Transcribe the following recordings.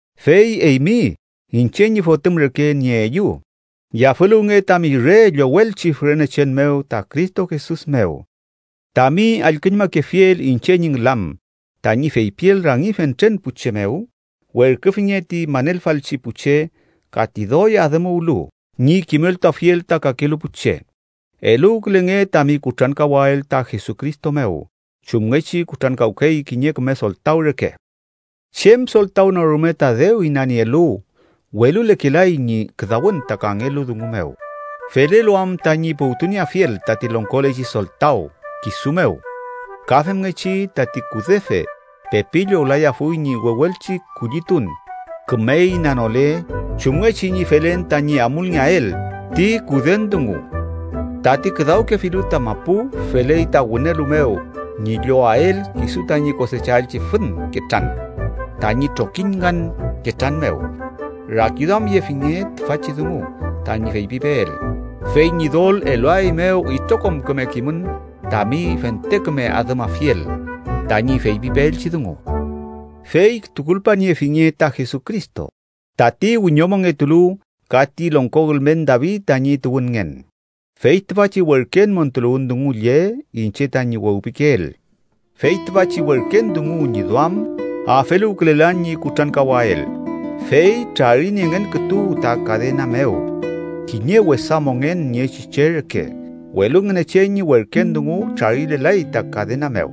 Fey eymi, iñche ñi fotüm reke nieeyu, yafüluwnge tami re llowelchi fürenechen mew ta Cristo Jesus mew. Tami allküñmakefiel iñche ñi ngülam tañi feypiel rangi fentren pu che mew, werküfinge ti manelfalchi pu che ka ti doy adümuwlu ñi kimeltuafiel ta kakelu pu che. Eluwkülenge tami kutrankawael ta Jesucristo mew chumngechi kutrankawkey kiñe küme soltaw reke. Chem soltaw no rume ta dew inanielu, welulekelay ñi küdawün ta kangelu dungu mew, felelu am tañi puwtunieafiel tati longkolechi soltaw kisu mew. Ka femngechi tati kudefe pepi llowlayafuy ñi wewelchi kullitun, küme inanole chumngechi ñi felen tañi amulngeael ti kuden dungu. Tati küdawkefilu ta mapu feley ta wünelu mew ñi llowael kisu tañi kosechaelchi fün ketran tañi trokiñ ngan ketran mew. Rakiduamyefinge tüfachi dungu tañi feypipeel, fey Ñidol eluaeymew itrokom küme kimün tami fente küme adümafiel tañi feypipeelchi dungu. Fey tukulpaniefinge ta Jesucristo, tati wiñomongetulu ka ti longko ülmen David tañi tuwünngen. Fey tüfachi werken montuluwün dungu lle iñche tañi wewpikeel. Fey tüfachi werken dungu ñi duam afeluwkülelan ñi kutrankawael, fey trariniengen kütu ta kadena mew kiñe wesa mongen niechi che reke, welu Ngünechen ñi werken dungu trarilelay ta kadena mew.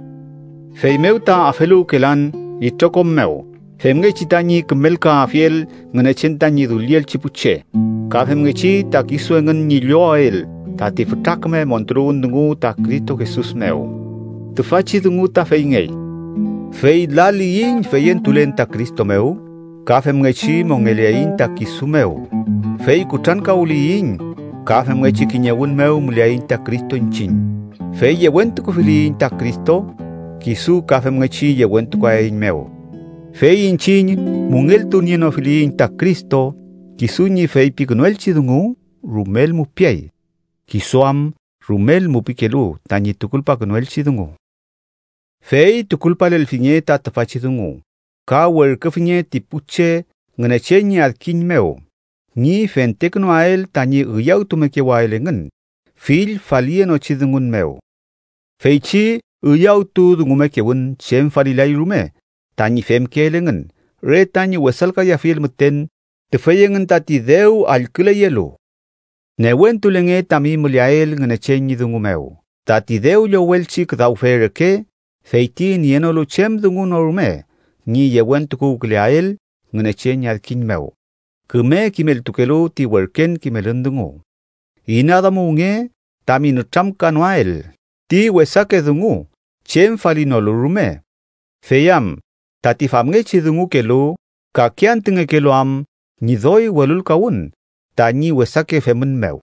Feymew ta afeluwkelan itrokom mew femngechi tañi kümelkaafiel Ngünechen tañi dullielchi pu che, ka femngechi ta kisu engün ñi llowael tati fütra küme montuluwün dungu ta Cristo Jesus mew. Tüfachi dungu ta feyngey: fey laliyiñ feyentulen ta Cristo mew, ka femngechi mongeleaiñ ta kisu mew. Fey kutrankawliyiñ, ka femngechi kiñewün mew müleaiñ Cristo iñchiñ. Fey yewentukufiliyiñ ta Cristo, kisu ka femngechi yewentukuaeiñmew. Fey iñchiñ müngeltunienofiliyiñ ta Cristo, kisu ñi feypikünuelchi dungu rumel mupiay, kisu am rumel mupikelu tañi tukulpakünuelchi dungu. Fey tukulpalelfinge ta tüfachi dungu, ka werküfinge ti pu che Ngünechen ñi adkiñ mew ñi fentekünuael tañi üyawtumekewael engün fill faliyenochi dungun mew. Feychi üyawtudungumekewün chem falilay rume tañi femkeel engün re tañi wesalkayafiel müten tüfey engün tati dew allküleyelu. Newentulenge tami müleael Ngünechen ñi dungu mew tati dew llowelchi küdawfe reke feyti nienolu chem dungu no rume ñi yewentukuwküleael Ngünechen ñi adkiñ mew küme kimeltukelu ti werken kimelün dungu. Inaduamuwnge tami nütramkanoael ti wesake dungu chem falinolu rume, fey am tati famngechi dungukelu kake antü ngekelu am ñi doy welulkawün tañi wesake femün mew.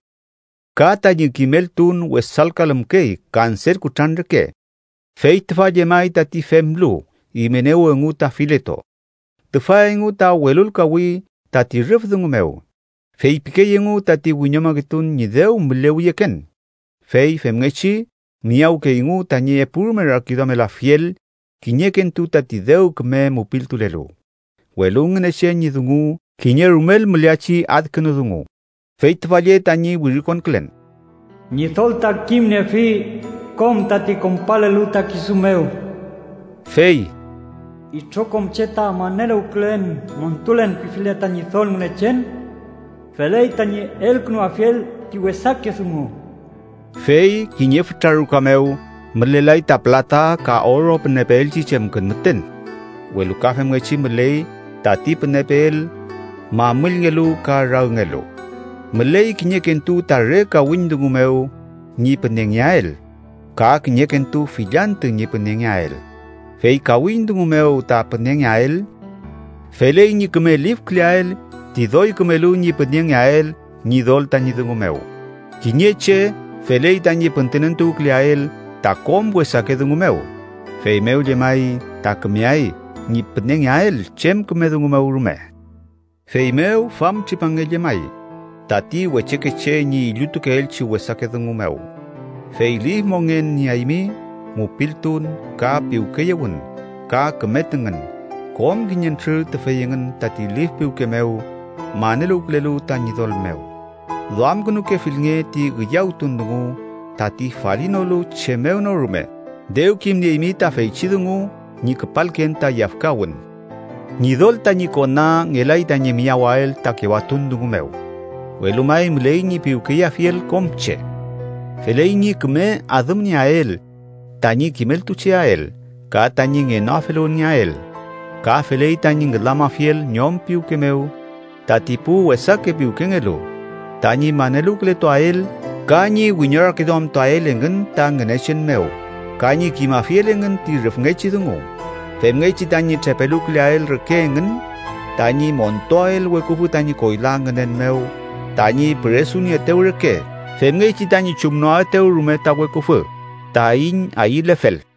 Ka tañi kimeltun wesalkalümkey kanser kutran reke. Fey tüfa llemay tati femlu Imenew engu ta Fileto. Tüfa engu ta welulkawi tati rüf dungu mew. Feypikey engu tati wiñomongetun ñi dew mülewiyeken, fey femngechi miyawkeyngu tañi epurume rakiduamelafiel kiñekentu tati dew küme mupiltulelu. Welu Ngünechen ñi dungu kiñe rumel müleachi adkünudungu, fey tüfa lle tañi wirikonkülen: “Ñidol ta kimniefi kom tati konpalelu ta kisu mew”. Fey “itrokom che ta maneluwkülen ‘montulen’ pifile ta Ñidol Ngünechen, feley tañi elkünuafiel ti wesake dungu.” Fey kiñe fütra ruka mew mülelay ta pülata ka oro pünepeelchi chemkün müten, welu ka femngechi müley tati pünepeel mamüllngelu ka ragngelu. Müley kiñekentu ta re kawiñ dungu mew ñi pünengeael ka kiñekentu fill antü ñi pünengeael. Fey kawiñ dungu mew ta pünengeael, feley ñi küme lifküleael ti doy kümelu ñi pünengeael Ñidol tañi dungu mew. Kiñe che feley tañi püntünentuwküleael ta kom wesake dungu mew, feymew llemay ta kümeay ñi pünengeael chem küme dungu mew rume. Feymew famtripange llemay tati wechekeche ñi illutukeelchi wesake dungu mew, fey lif mongen nieaymi, mupiltun ka piwkeyewün ka küme tüngün, kom kiñentrür tüfey engün tati lif piwke mew maneluwkülelu ta Ñidol mew. Duamkünukefilnge ti üyawtun dungu tati falinolu chem mew no rume. Dew kimnieymi ta feychi dungu ñi küpalken ta yafkawün. Ñidol tañi kona ngelay tañi miyawael ta kewatun dungu mew, welu may müley ñi piwkeyeafiel kom che. Feley ñi küme adümnieael tañi kimeltucheael ka tañi ngenoafeluwünngeael. Ka feley tañi ngülamafiel ñom piwke mew tati pu wesake piwkengelu, tañi maneluwkületuael ka ñi wiñorakiduamtuael engün ta Ngünechen mew ka ñi kimafiel engün ti rüfngechi dungu, femngechi tañi trepeluwküleael reke engün tañi montuael weküfü tañi koyla ngünen mew tañi püresunieetew reke femngechi tañi chumnoaetew rume ta weküfü taiñ ayülefel.